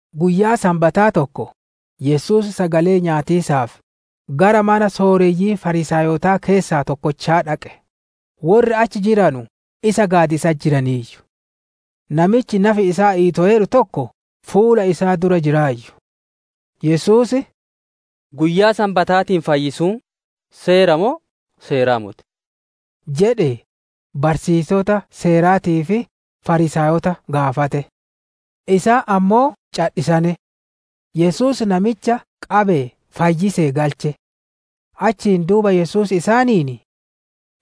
Guyyaa Sanbataa tokko, Yesuus sagalee nyaatiisaaf, gara mana sooreyyii Fariisaayota keessaa tokkochaa dhaqe; worri achi jiranu isa gaadiisatti jiraniiyyu. Namichi nafi isaa iitoweeru tokko fuula isaa dura jiraayyu. Yesuus, «Guyyaa Sanbataatiin fayyisuun seeraa moo seera moti?» jedhee barsiisota Seeraatii fi Fariisaayota gaafate. Isaan ammoo cadhisane. Yesuus namicha qabee fayyisee galche. Achiin duuba Yesuus isaaniin,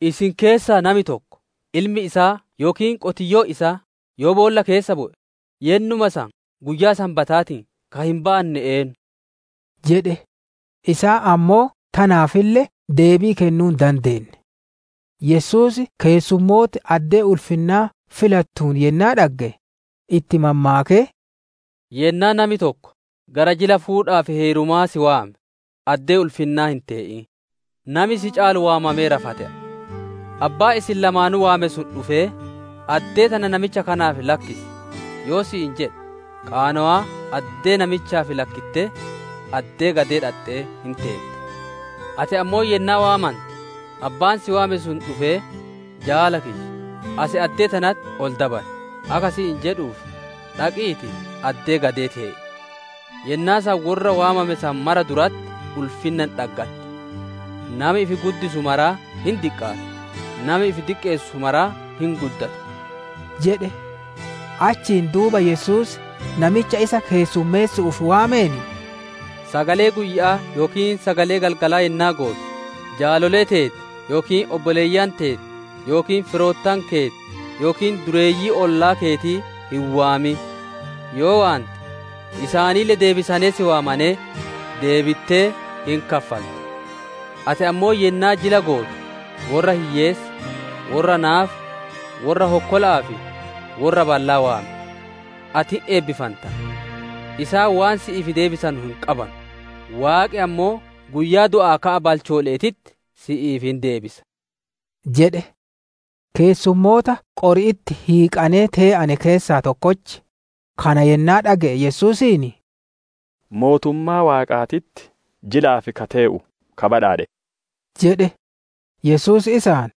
«Isin keessaa nami tokko, ilmi isaa yookiin qotiyyoon isaa yoo boolla keessa bu'e, yennuma san guyyaa Sanbataatiin ka hin baanne eennu?» jedhe. Isaan ammoo tanaafille deebii kennuu hin dandeenne. Yesuus keessumooti addee ulfinnaa filattuun yennaa dhagge, itti mammaakee, «Yennaa nami tokko gara jila fuudhaa fi heerumaa si waame, addee ulfinnaa hin tee'in, nami si caalu waamameera fa te'a. Abbaan isin lamaanuu waame sun dhufee, ‹Addee tana namicha kanaaf lakkisi› yoo si'iin jedhe, qaanowaa addee namichaaf lakkittee, addee gadee dhaxxee hin teetta. Ati ammoo yennaa waamante, abbaan si waame sun dhufee, ‹Jaala kiyya, as addee tanatti ol dabar› akka si'iin jedhuuf, dhaqiitii addee gadee tee'i. Yennaa san worra waamame san mara duratti ulfinna hin dhaggatta. Nami ifi guddisu maraa hin diqqaata, nami ifi diqqeessu maraa hin guddata» jedhe. Achiin duuba Yesuus namicha isa keessummeessu'uuf waameen, «Sagalee guyya'aa yookiin sagalee galgalaa yennaa gootu, jaalolee teeti yookiin obboleeyyan teeti yookiin firoottan keeti yookiin dureeyyii ollaa keetii hin waamin; yoo waante, isaanille deebisanee si waamanee, deebittee hin kaffalta. Ati ammoo yennaa jila gootu, worra hiyyeessa, worra naafa, worra hokkola'aa fi worra ballaa waami! Ati hin eebbifanta; isaan waan si'iif deebisanu hin qabanu, Waaqi ammoo guyyaa du'aa ka'a balchoole'eetitti si'iif hin deebisa» jedhe. Keessummoota qori'itti hiiqanee tee'ane keessaa tokkochi, kana yennaa dhage'e Yesuusiin, «Mootummaa Waaqaatitti jilaaf ka tee'u ka badhaadhe!» jedhe. Yesuus isaan,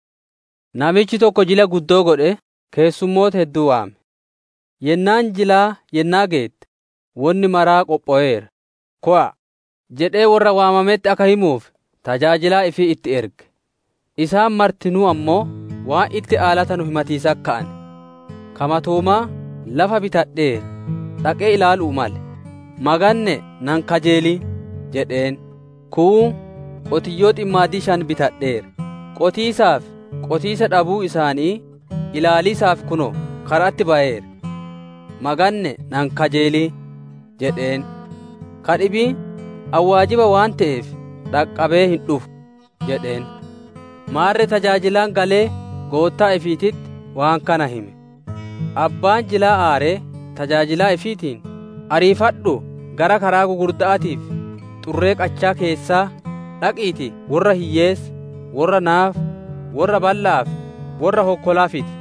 «Namichi tokko jila guddoo godhee keessummoota hedduu waame. Yennaan jilaa yennaa geette, ‹Wonni maraa qophoweera, kowa'a!› jedhee worra waamametti akka himuuf tajaajilaa ifii itti erge. Isaan martinuu ammoo waan itti aalatanu himatiisatti ka'ane. Ka matoomaa, ‹Lafa bitadheera, dhaqee ilaalu'uu male; maganne'e na hin kajeelin!› jedheen. Kuun, ‹Qotiyyoo ximmaadii shan bitadheera, qotiisaa fi qotiisa dhabuu isaanii ilaaliisaaf kunoo kara'atti bayeera; maganne'e na hin kajeelin!› jedheen. Ka dhibiin, ‹Ani waajiba waan te'eef, dhaqqabee hin dhufu› jedheen. Maarre tajaajilaan galee goottaa ifiititti waan kana hime. Abbaan jilaa aaree tajaajilaa ifiitiin, ‹Ariifadhuu gara karaa gugurda'aatii fi xurree qachaa keessaa dhaqiitii worra hiyyeessa, worra naafa, worra balla'aa fi worra hokkolaa fidi!›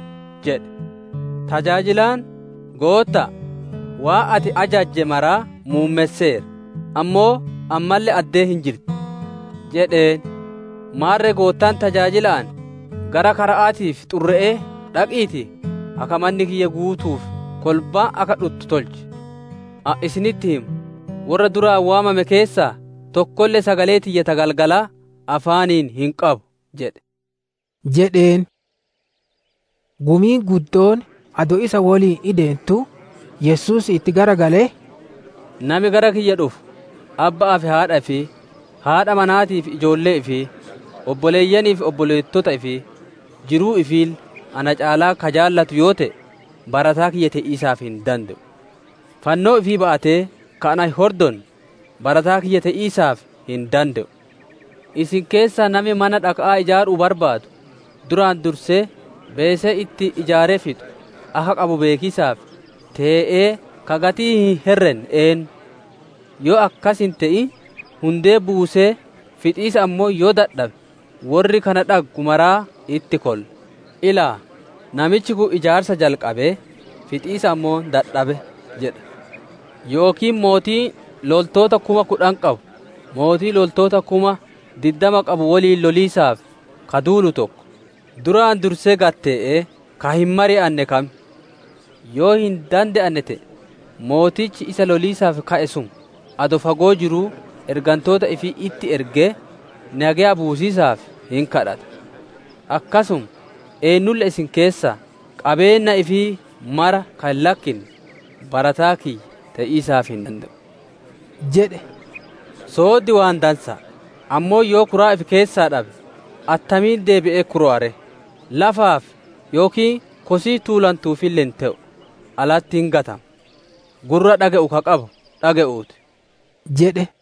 jedhe. Tajaajilaan, ‹Gootta'a, waan ati ajajje maraa muummesseera, ammoo ammalle addeen hin jirti!› jedheen. Maarre goottaan tajaajila'aan, ‹Gara kara'aatii fi xurre'ee dhaqiitii, akka manni kiyya guutuuf kolbaan akka dhuttu tolchi! Ani isinitti hima, worra duraan waamame keessaa tokkolle sagalee tiyya ta galgalaa afaaniin hin qabu!› jedhe» jedheen. Gumiin guddoon adoo isa woliin ideentuu, Yesuus itti garagalee, «Nami gara kiyya dhufu, abba'aa fi haadha ifii, haadha manaatii fi ijoollee ifii, obboleeyyanii fi obboleettota ifii, jiruu ifiille na caalaa ka jaalatu yoo te'e, barataa kiyya te'iisaaf hin dande'u. Fannoo ifii ba'atee ka na hin hordonne, barataa kiyya te'iisaaf hin dande'u. «Isin keessaa nami mana dhaka'aa ijaaruu barbaadu, duraan dursee beesee ittiin ijaaree fixu akka qabu beekiisaaf, tee'ee ka gatii hin herrenne eennu? Yoo akkas hin te'in, hundee buusee fixiisa ammoo yoo dadhabe, worri kana dhaggu maraa itti kolla; ‹Ilaa, namichi kun ijaarsa jalqabee fixiisa ammoo dadhabe› jedha. Yookiin mootiin loltoota kuma kudhan qabu, mootii loltoota kuma diddama qabu woliin loliisaaf ka duulu tokko, duraan dursee gad tee'ee ka hin mari'anne kam? Yoo hin dandeenne te'e, mootichi isa loliisaaf ka'e sun adoo fagoo jiruu ergantoota ifii itti ergee nageya buusiisaaf hin gaafata. Akkasuma, eennulle isin keessaa qabeenna ifii mara ka hin lakkinne barataa kiyya te'iisaaf hin dande'u» jedhe. «Sooddi waan dansa'a, ammoo yoo kuraa ifi keessaa dhabe, attamiin deebi'ee kurowa ree? Lafaaf yookiin kosii tuulantuufille hin te'u; alatti hin gatama. Gurra dhage'u ka qabu dhage'uuti!» jedhe.